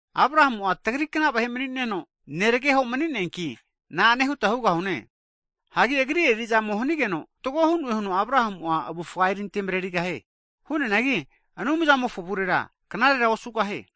Abrahamu'a tagrikna vahe mni'neno, neregeho mni'neaki, na'ane huta hugahune? Hagi agri eri'zamoma hanigeno fatgo hu'noe huno Abrahamu'a avufga erinte mrerigahie. Hu'neanagi Anumzamofo avurera knarera osugahie.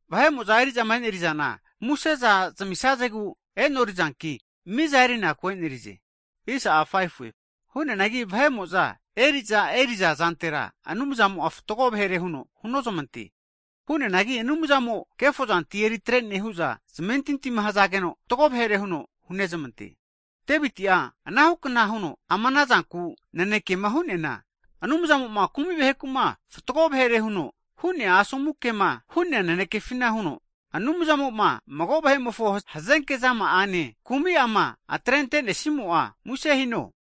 Vahe'mo'za eri'zama enerizana muse'za zmisazegu e'norezanki, miza erinaku enerize Hu'neanagi vahe'mo'za eri'za eri'zazantera Anumzamo'a fatgo vahere huno hunozamante, hu'neanagi Anumzamo'a kefozanti eritrene hu'za zamentintima hazageno, fatgo vahere huno hunezmante. Deviti'a anahukna huno ama anazanku nanekema hu'neana, Anumzamo'ma kumi vahekuma fatgo vahere huno hu'nea asomu kema hu'nea nanekefina huno, Anumzamo'ma magomofo hazenke zama'ane, kumi'ama atrentenesimo'a muse hiho.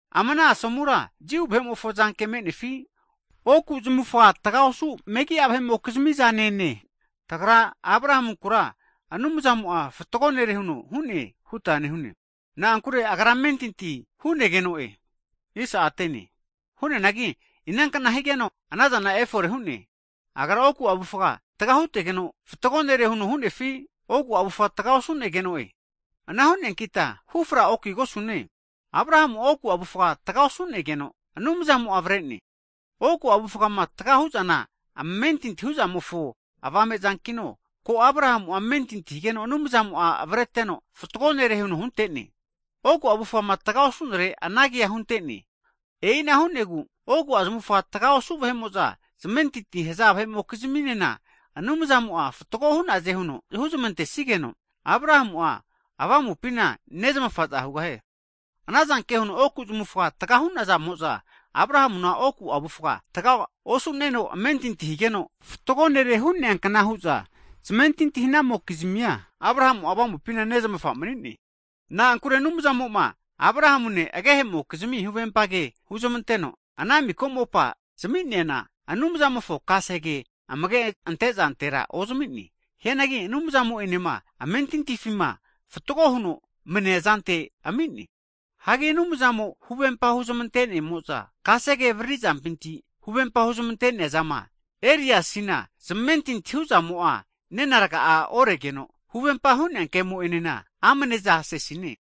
Ama ana asomura Jiu vahe'mofo zanke me'nefi, oku zamavufga taga osu megi'a vahe'mokizmi zanene? Tagra Abrahamunkura, Anumzamo'a fatgo nere huno hu'ne huta nehune. Na'ankure agra amentinti hu'negeno'e. Hu'neanagi inankna higeno anazana efore hu'ne? Agra oku avufga tga hutegeno fatgo nere huno hu'nefi, oku avufga tga osu'negeno'e? Ana hu'neankita hufra okigosune. Abrahamu'a oku avufga tga osu'negeno Anumzamo'a avarene. Oku avufgama tga hu'zana amentinti huzamofo avame zankino, ko Abrahamu'a amentinti higeno Anumzamo'a avregeno, fatgo nere huno huntene. Oku avufgama tga osunere anagea huntene. E'ina hu'negu oku zamavufga tga osu vahe'mo'za zamentintima haza vahe'mokiziminena, Anumzamo'a fatgo hu'naze huno huzmantesigeno, Abrahamu'a avamupina nezmafaza hugahie. Anazanke huno oku zamufga tga hu'nazamo'za Abrahamuma oku avufga tga osu'neno amentinti higeno, fatgo nere hu'neakna hu'za zamentinti hanaza vahe'mokizmia, Abrahamu'a avamupina nezmafa mani'ne. Na'ankure Anumzamo'ma Abrahamune agehe'mokizmi huvempa ke huzmanteno, ana miko mopa zami'neana Anumzamofo kasege amage antezantera ozami'ne. Hianagi Anumzamo'enema amentintifima fatgo huno mania zante ami'ne. Hagi Anumzamo huvempa huzmante'nemo'za kasege avriri zampinti huvempa huzmante'neazama erizasina zmentinti hu'zamo'a nena rga'a oregeno, huvempa hu'nea kemo'enena amne'za sesine.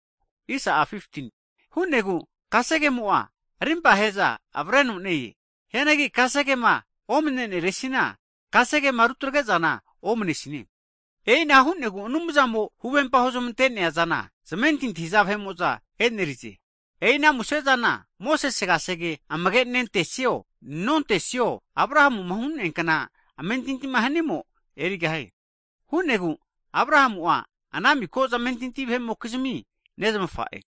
Hu'negu kasege'mo'a arimpahe'za avreno ne-e. Hianagi kasegema omneresina kasegema rutagre'zana omanesine. E'ina hu'negu Anumzamo huvempa huzmante'neazana zmentinti haza vahe'mo'za enerize. E'i ana musezana Mosese kasege amage nentesio, nontesio Abrahamuma hu'neankna amentintima hanimo erigahie. Hu'negu Abrahamu'a ana miko zamentini vahe'mokizimi nezamafa'e.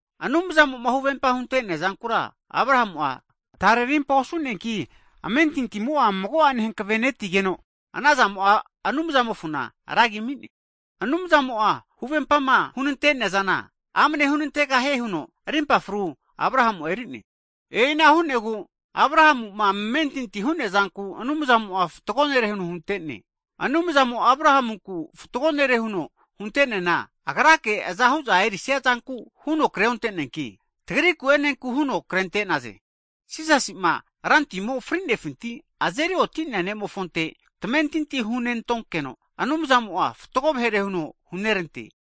Anumzamo'ma huvempa hunte'nea zankura Abrahamu'a tare rimpa osu'neanki, amentintimo'a mago'ane hankavenetigeno anazamo'a Anumzamofona ragia ami'ne. Anumzamo'a huvempama hunante'neazana amane hunantegahie huno rimpa fru Abrahamu'a erine. E'ina hu'negu Abrahamuma amentinti hu'nea zanku, Anumzamo'a fatgo nere huno huntene. Anumzamo Abrahamunku fatgo nere huno hunte'neana, agrake azahu'za erisia zanku huno kreonte'neanki, tagriku enenku huno krente'naze. Jisasi'ma fri'nefinti azeri oti'nea Rantimofonte tamentinti hunentonkeno, Anumzamo'a tazeri agru hunerantene.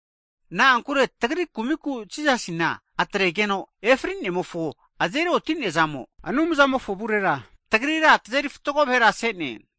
Na'ankure tagri kumiku Jisasina atregeno efri'nemofo azeri oti'nea zamo, Anumzamofo avurera tagrira tazeri fatgo vahera se'ne.